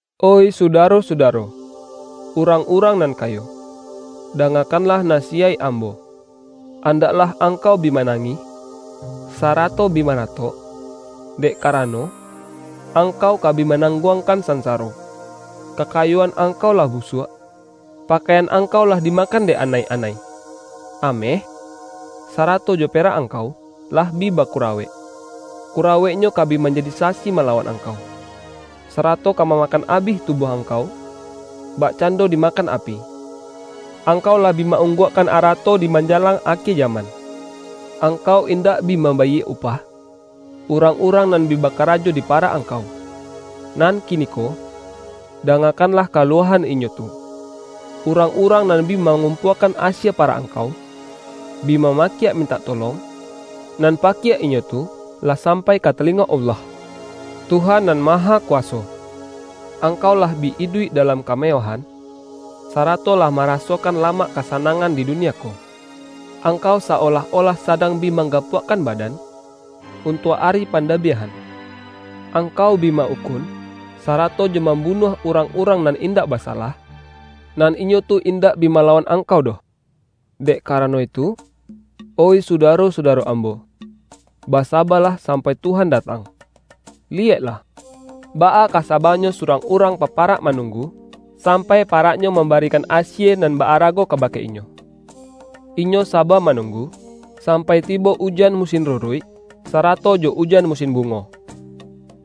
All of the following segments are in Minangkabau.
Oih sudaro-sudaro, urang-urang nan kayo! Dangakanlah nasiyaik ambo. Andaklah angkau bi manangih, sarato bi maratok, dek karano, angkau ka bi manangguangkan sansaro! Kaka-yoan angkau lah busuak. Pakaian ang-kau lah dimakan dek anai-anai. Ameh, sarato jo perak angkau, lah bi bakura-wek; kuraweknyo ka bi manjadi sasi malawan angkau, sarato ka mamakan abih tubuah angkau, bakcando dima-kan api. Angkau lah bi ma-ungguakkan arato di manjalang akie jaman. Ang-kau indak bi mambayie upah, urang-urang nan bi bakarajo di parak angkau. Nan kiniko, dangakanlah kaluahan inyo tu! Urang-urang nan bi mangum-puakan asie parak angkau, bi mama-kiak mintak tolong, nan pakiak inyo tu lah sampai ka talingo Allah, Tuhan Nan Mahakuwaso. Angkau lah bi iduik da-lam kamewahan, sarato lah marasokan lamak kasanangan di dunia ko. Angkau sa-olah-olah sadang bi manggapuakkan badan, untuak ari pandabiahan. Ang-kau bi ma-ukun, sarato jo mambunuah urang-urang nan indak basalah, nan inyo tu indak bi malawan angkau doh. Dek karano itu, oih sudaro-suda-ro ambo, basabalah sampai Tuhan datang. Liyeklah, baa ka saba-nyo surang urang paparak manunggu, sampai pa-raknyo mambarikan asie nan ba-ara-go kabake inyo. Inyo saba manunggu, sampai tibo ujan musin ruruik, sara-to jo ujan musin bungo.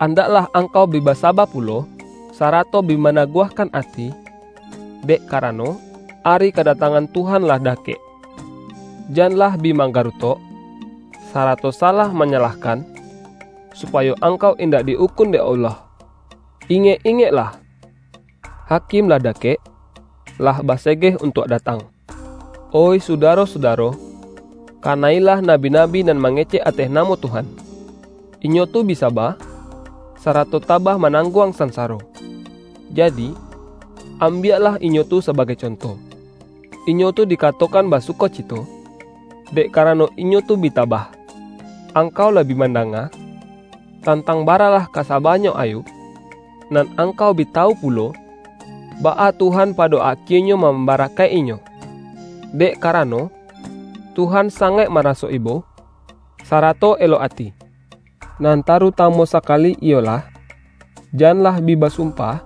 Andaklah angkau bi basaba pulo, sarato bi ma-naguahkan ati, dek karano, ari kada-tangan Tuhan lah dakek. Janlah bi manggarutok, sarato sa-lah manyalahkan, supayo angkau in-dak di-ukun dek Allah. Ingek-ingek-lah! Hakim lah dakek, lah basegeh untuak datang. Oih sudaro-sudaro, kana-ilah nabi-nabi nan mangecek ateh namo Tuhan. Inyo tu bi saba, sa-rato tabah manangguang sansaro. Ja-di, ambiaklah inyo tu sabagai conto. Inyo tu dikatokan basukocito, dek karano inyo tu bi tabah. Angkau lah bi mandanga, tantang baralah ka sa-banyo Ayub, nan angkau bi tawu pu-lo, baa Tuhan pado akienyo mam-barakaik-inyo. Dek karano, Tuhan sangaik maraso ibo, sarato elok ati. Nan tarutamu sakali, iyolah: Jan-lah bi basumpah,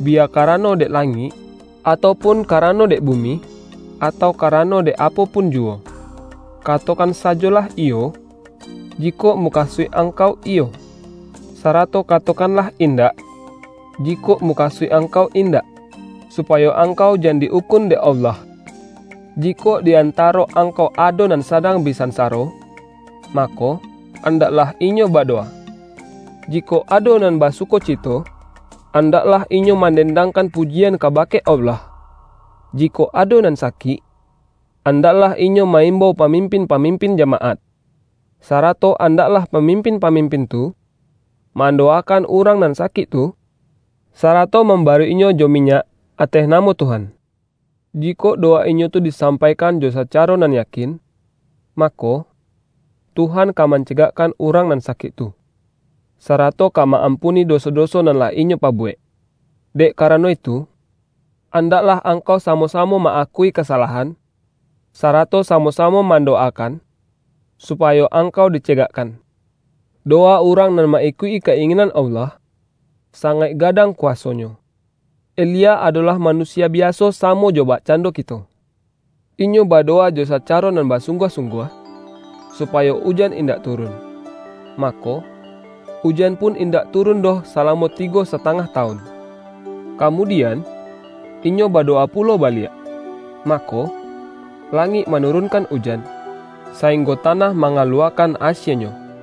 biya karano dek la-ngik, atau pun karano dek bumi, atau karano dek apo pun juwo. Katokan sajolah”Iyo” jikok mukasuik angkau iyo, sarato katokanlah”Indak” jikok mukasuik angkau indak; supayo ang-kau jan di-ukun dek Allah. Jikok di antaro angkau ado nan sadang bi sansaro, mako, andaklah inyo badowa. Jikok ado nan basu-kocito, andaklah inyo mandendang-kan pujian kabake Allah. Jikok ado nan sakik, andaklah inyo ma-imbau pamimpin-pamimpin jamaat. Sara-to andaklah pamimpin-pamimpin tu, mandowakan urang nan sakik tu, sa-rato mambaruik-inyo jo minyak ateh namo Tuhan. Jikok dowa inyo tu disampaikan jo sacaro nan yakin, mako, Tuhan ka mancegakkan urang nan sakik tu, sarato ka ma-ampuni doso-doso nan lah inyo pabuwek. Dek karano itu, an-daklah angkau samo-samo ma-akui kasalahan, sarato samo-samo mando-wakan, supayo angkau dicegakkan. Dowa urang nan ma-ikuik-i ka-ingin-an Allah, sangaik gadang kuwasonyo. Elia adolah manusia biaso samo jo bakcando kito. Inyo badowa jo saca-ro nan basungguah-sungguah, supayo ujan indak turun, mako, ujan pun in-dak turun doh salamo tigo satangah tawun. Kamudian, inyo badowa pulo baliak, mako, langik manurun-kan ujan, sainggo tanah mangaluwa-kan asienyo.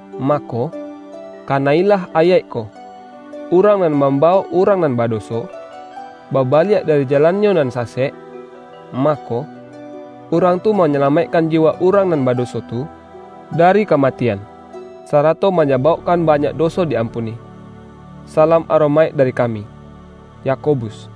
mako, kana-ilah ayaik ko: Urang nan mambawok urang nan badoso, babaliak dari ja-lannyo nan sasek, mako, urang tu ma-nyalamaikkan jiwa urang nan badoso tu dari kamatian, sarato manyabauk-kan banyak doso di-ampuni. Salam aromaik dari kami, Yakobus